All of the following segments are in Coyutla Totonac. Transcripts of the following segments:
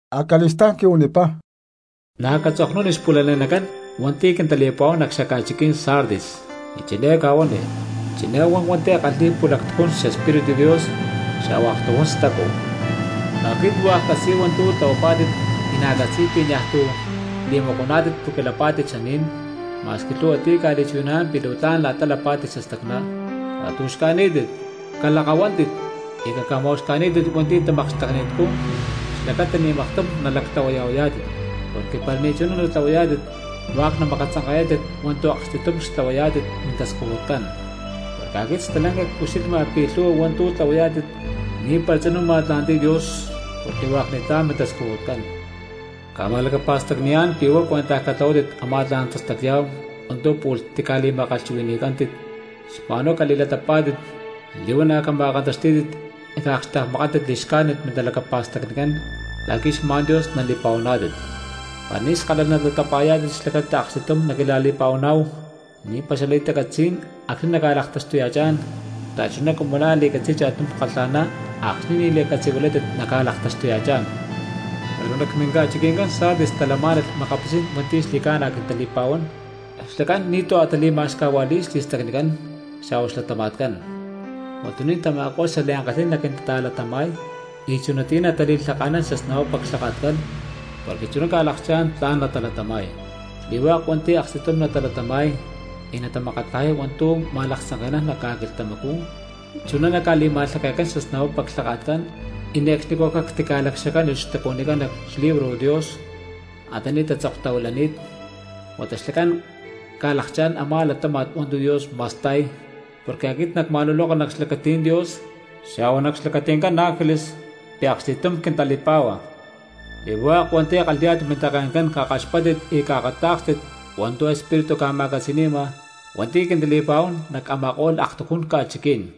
Acali̠stá̠n quihuanipá: —Na̠ catzoknuni xpu̠lale̠nacán hua̠nti̠ quintali̠pa̠huán nac xaca̠chiquí̠n Sardis, y chiné cahuani: “Chiné huan hua̠nti̠ kalhi̠y pu̠lactujún xEspíritu Dios xa̠hua aktujún stacu: Aquit hua̠k ccatzi̠y hua̠ntu̠ tlahuapá̠tit y na̠ ccatzi̠y pi̠ niaj tu̠ li̠macuaná̠tit porque lapá̠tit xaní̠n, ma̠squi lhu̠hua ti̠ ca̠li̠chuhui̠naná̠n pi̠ luu tla̠n la̠ta lapá̠tit xastacná. Catu̠xca̠ní̠tit, calakahuántit, y caca̠ma̠uxca̠ní̠tit hua̠ntu̠ tamakxtekni̠tcú xlacata ni̠ maktum nalactlahuaya̠huayá̠tit, porque para ni̠ chuná natlahuayá̠tit hua̠k namakatzanka̠yá̠tit hua̠ntu̠ aksti̠tum xtlahuayá̠tit mintascujutcán, porque aquit stalanca cucxilhma pi̠ lhu̠hua hua̠ntu̠ tlahuayá̠tit ni̠para tzinú ma̠tla̠nti̠y Dios porque hua̠k ni̠tlá̠n mintascujutcán. Cca̠ma̠lacapa̠stacni̠yá̠n pi̠ huá cuentaj catlahuátit a̠má tla̠n tastacya̠hu hua̠ntu̠ pu̠lh tica̠li̠ma̠kalhchuhui̠ni̠cántit, xma̠n huá cali̠latapá̠tit li̠huana̠ cama̠kantaxtí̠tit y caakxtekmakántit li̠xcájnit mintalacapa̠stacnicán la̠qui̠ xma̠n Dios nali̠pa̠huaná̠tit. Para ni̠ skalalh latapa̠yá̠tit xlacata aksti̠tum naquila̠li̠pa̠huaná̠hu, ni̠para xali̠tacatzí̠n acxni̠ naclaktaxtuya̠chá̠n xta̠chuná cumu la̠ li̠catzi̠y cha̠tum kalha̠ná, acxni̠ ni̠ li̠a̠catzi̠huilátit naca̠laktaxtuya̠chá̠n. Pero nac tamá minca̠chiqui̠ncán Sardis talamá̠nalh makapitzí̠n hua̠nti̠ xli̠ca̠na quintali̠pa̠huán, xlacán ni̠tu̠ a̠ tali̠ma̠xcajua̠li̠y xli̠stacnicán xa̠hua xlatama̠tcán, huatuní̠n tama̠ko̠lh xliankalhí̠n naquintata̠latama̠y y chunatiyá natali̠lhaka̠nán xasnapapa clhaka̠tcán porque chuná ca̠lakchá̠n tla̠n natalatama̠y. Xli̠hua̠k hua̠nti̠ aksti̠tum natalatama̠y y natamakatlajay hua̠ntu̠ ma̠laktzanke̠nán nac ca̠quilhtamacú, chuná naca̠li̠ma̠lhake̠cán xasnapapa clhaka̠tcán, y ne̠cxnicú cactica̠lacxacánilh xtacuhuinicán nac xlibro Dios antaní tatzoktahuilani̠t, huata xlacán ca̠lakchá̠n a̠má latáma̠t hua̠ntu̠ Dios ma̠sta̠y porque aquit nacma̠luloka nac xlacatí̠n Dios xa̠hua nac xlacati̠ncán ángeles pi̠ aksti̠tum quintali̠pá̠hua.” ’¡Xli̠hua̠k hua̠nti̠ kalhi̠yá̠tit mintake̠ncán cakaxpáttit y caakatá̠kstit hua̠ntu̠ Espíritu ca̠ma̠catzi̠ni̠ma hua̠nti̠ quintali̠pa̠huán nac a̠ma̠ko̠lh aktujún ca̠chiquí̠n!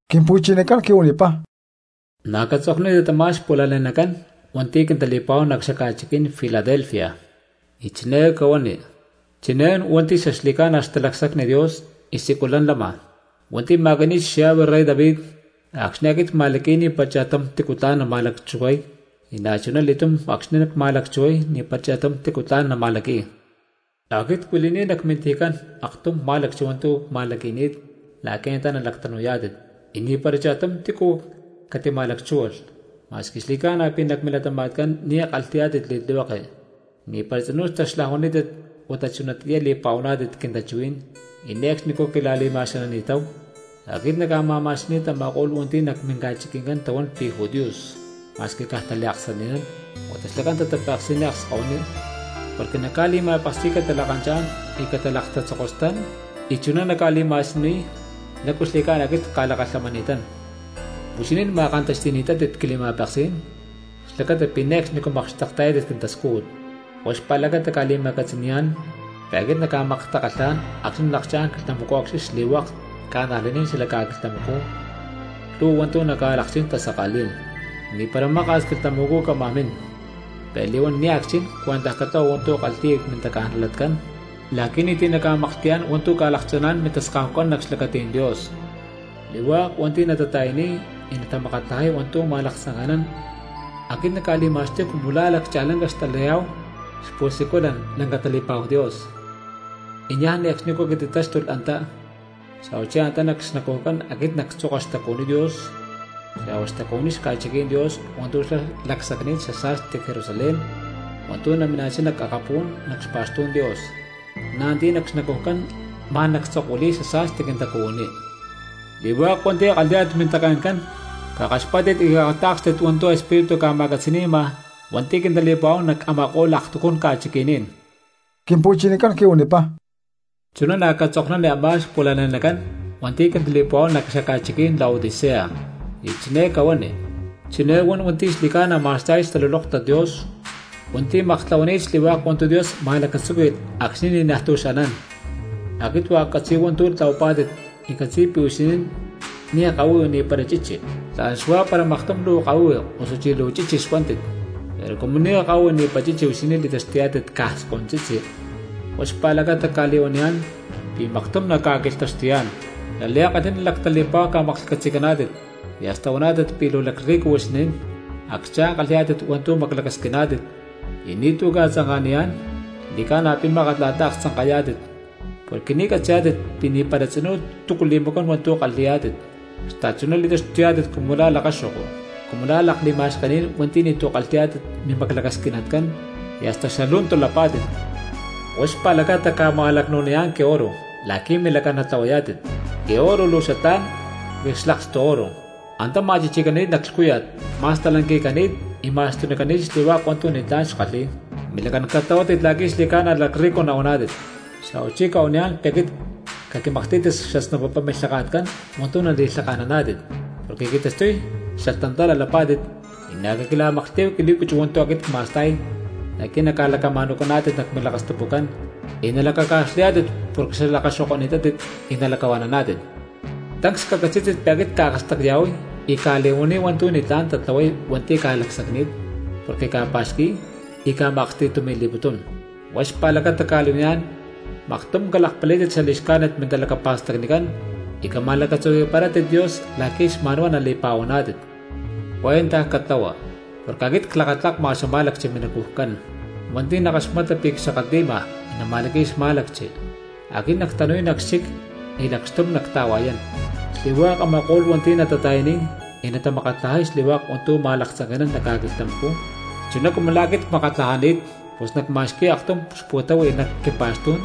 Quimpu̠chinacán quihuanipá: —Na̠ catzoknuni tamá xpu̠lale̠nacán hua̠nti̠ quintali̠pa̠huán nac xaca̠chiquí̠n Filadelfia, y chiné cahuani: “Chiné huan hua̠nti̠ xaxli̠ca̠na xtalacsacni Dios y siculán lama, hua̠nti̠ ma̠qui̠ni̠t xllave rey David: Acxni̠ aquit cma̠laqui̠y ni̠para cha̠tum tícu tla̠n nama̠lacchuhuay, y na̠chuna li̠túm acxni̠ cma̠lacchuhuay ni̠para cha̠tum tícu tla̠n nama̠laqui̠y. Aquit cuili̠ni̠t nac mintijicán aktum má̠lacchi hua̠ntu̠ cma̠laqui̠ni̠t la̠qui̠ antá nalactanu̠yá̠tit, y ni̠para cha̠tum tícu catima̠lacchúhualh. Ma̠squi xli̠ca̠na pi̠ nac milatama̠tcán ni̠ kalhi̠yá̠tit li̠tlihueke, ni̠para tzinú taxlajuani̠ni̠tátit huata chunatiyá li̠pa̠huani̠tátit quintachuhuí̠n y ne̠cxnicú quila̠li̠ma̠xanani̠táhu. Aquit nacca̠ma̠ma̠xani̠y tama̠ko̠lh hua̠nti̠ nac minca̠chiqui̠ncán tahuán pi̠ judíos ma̠squi caj taliaksani̠nán, huata xlacán tatapeksi̠niy akskahuiní, porque nacca̠li̠ma̠peksi̠y catalakanchá̠n y catalakatatzokostán y chuná nacca̠li̠ma̠siyuniy lácu xli̠ca̠na aquit cca̠lakalhamani̠tán. Huixinín ma̠kantaxti̠ni̠tátit quili̠ma̠peksí̠n xlacata pi̠ ne̠cxnicú makxtekta̠yátit quintascújut, huá xpa̠lacata cca̠li̠ma̠catzi̠ni̠yá̠n pi̠ aquit nacca̠maktakalhá̠n acxni̠ nalakchá̠n quilhtamacú acxni̠ xli̠hua̠k cristianos xalac ca̠quilhtamacú lhu̠hua hua̠ntu̠ naca̠lakchí̠n tasaka̠lí̠n. Ni̠para maka̠s quilhtamacú cámaj min, pero li̠huán nia̠ cchin cuentaj catlahua hua̠ntu̠ kalhi̠ya mintaca̠najlatcán la̠qui̠ ni̠ti̠ naca̠maklhti̠yá̠n hua̠ntu̠ ca̠lakcha̠ná̠n mintaskahucán nac xlacatí̠n Dios. Xli̠hua̠k hua̠nti̠ natata̠yaniy y natamakatlajay hua̠ntu̠ ma̠laktzanke̠nán, aquit nacca̠li̠ma̠xtuy cumu la̠ laccha̠lanca xatalayá̠hu xpu̠siculan lanca tali̠pa̠hu Dios, y niaj ne̠cxnicú catitatáxtulh antá, xa̠huachí antá nac xnacujcán aquit nactzoka xtacuhuiní Dios xa̠hua xtacuhuiní xca̠chiquí̠n Dios hua̠ntu̠ xlá lacsacni̠t xasa̠sti Jerusalén hua̠ntu̠ namina̠chá nac akapú̠n nac xpa̠xtú̠n Dios, na̠ antiyá nac xnacujcán ma̠n nactzokuili̠y xasa̠sti quintacuhuiní.” ’¡Xli̠hua̠k hua̠nti̠ kalhi̠yá̠tit mintake̠ncán cakaxpáttit y caakatá̠kstit hua̠ntu̠ Espíritu ca̠ma̠catzi̠ni̠ma hua̠nti̠ quintali̠pa̠huán nac a̠ma̠ko̠lh aktujún ca̠chiqui̠ní̠n! Quimpu̠chinacán quihuanipá: —Chú na̠ catzoknuni a̠má xpu̠lale̠nacán hua̠nti̠ quintali̠pa̠huán nac xaca̠chiquí̠n Laodicea, y chiné cahuani: “Chiné huan hua̠nti̠ xli̠ca̠na ma̠sta̠y xtalulóktat Dios hua̠nti̠ ne̠cxnicú huani̠t taaksaní̠n, hua̠nti̠ maktlahuani̠t xli̠hua̠k hua̠ntu̠ Dios ma̠lacatzúqui̠lh acxni̠ ni̠najtu̠ xanán: Aquit hua̠k ccatzi̠y hua̠ntu̠ tlahuapá̠tit, y ccatzi̠y pi̠ huixinín ni̠ kahuihui ni̠para chichi. ¡Tla̠n xuá para maktum luu kahuihui osuchí luu chichi xuántit! Pero cumu ni̠ kahuihui ni̠para chichi huixinín li̠taxtuyá̠tit caj skontzitzi, huá xpa̠lacata cca̠li̠huaniyá̠n pi̠ maktum nacca̠quilhtaxtuyá̠n. Xliankalhi̠ná lactali̠pa̠hu ca̠maklhcatzi̠caná̠tit, y hasta huaná̠tit pi̠ luu lacrrico huixinín, acchá̠n kalhi̠yá̠tit hua̠ntu̠ maclacasquiná̠tit y ni̠tu̠ ca̠tzanka̠niyá̠n. Xli̠ca̠na pi̠ mákat la̠ta aktzanka̠ta̠yayá̠tit porque ni̠ catzi̠yá̠tit pi̠ ni̠para tzinú túcu li̠macuán hua̠ntu̠ kalhi̠yá̠tit, xta̠chuná li̠taxtuyá̠tit cumu la̠ lakaxo̠ko, cumu la̠ lakli̠ma̠xkení̠n hua̠nti̠ ni̠tu̠ kalhi̠yá̠tit mimaclacasquinitcán, y hasta xalu̠ntu lapá̠tit. Huá xpa̠lacata cca̠ma̠lacnu̠niyá̠n quioro la̠qui̠ milacán natlahuayá̠tit. Quioro luu xatlá̠n porque xlakstu oro, antá ma̠chichi̠cani̠t nac lhcúya̠t, ma̠stalanqui̠cani̠t y ma̠xtunícalh xli̠hua̠k hua̠ntu̠ ni̠tlá̠n xkalhi̠y. Milacán cali̠tlahuátit la̠qui̠ xli̠ca̠na lacrrico nahuaná̠tit. Xa̠huachí cca̠huaniyá̠n pi̠ aquit caquimaklhtí̠tit xasnapapa milhaka̠tcán hua̠ntu̠ nali̠lhaka̠naná̠tit porque qui̠taxtuy xalhtantala lapá̠tit, y na̠ caquila̠maklhtí̠hu quili̠cuchu hua̠ntu̠ aquit cma̠sta̠y la̠qui̠ naca̠lacama̠nu̠caná̠tit nac milakastapucán y nalacaca̠xlayá̠tit porque xlakaxo̠ko̠ni̠tátit, y nalacahua̠naná̠tit. Tancs cacatzí̠tit pi̠ áquit cca̠akastacya̠huay y cca̠li̠huaníy hua̠ntu̠ ni̠tlá̠n tatlahuay hua̠nti̠ cca̠lacsacni̠t porque cca̠pa̠xqui̠y y cca̠ma̠aksti̠tumi̠li̠putún; huá xpa̠lacata cca̠li̠huaniyá̠n maktum calakpalí̠tit xali̠xcájnit mintalacapa̠stacnicán y cama̠lacatzuhui̠parátit Dios la̠qui̠ xma̠n huá nali̠pa̠huaná̠tit. Cuentaj catlahua porque aquit clakatlakma cxama̠lacchi minacujcán, hua̠nti̠ nakaxmata pi̠ cxakatli̠ma y nama̠laqui̠y xmá̠lacchi, aquit nactanu̠y nac xchic y lacxtum nacta̠hua̠yán. Xli̠hua̠k a̠ma̠ko̠lh hua̠nti̠ natata̠yaniy y natamakatlajay xli̠hua̠k hua̠ntu̠ ma̠laktzanke̠nán nac ca̠quilhtamacú chuná cumu la̠ aquit cmakatlajani̠t, pus nacma̠xqui̠y aktum xpu̠táhui̠lh nac quimpa̠xtú̠n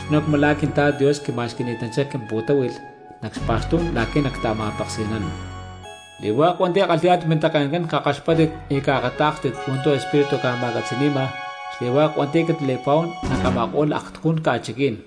chuná cumu la̠ quintla̠t Dios quima̠xqui̠ni̠tanchá quimpu̠táhui̠lh nac xpa̠xtú̠n laqui̠ nacta̠ma̠peksi̠nán.” ’¡Xli̠hua̠k hua̠nti̠ kalhi̠yá̠tit mintake̠ncán cakaxpátit y caakatá̠kstit hua̠ntu̠ Espíritu ca̠ma̠catzi̠ni̠ma xli̠hua̠k hua̠nti̠ quintali̠pa̠huán nac a̠ma̠ko̠lh aktujún ca̠chiquí̠n!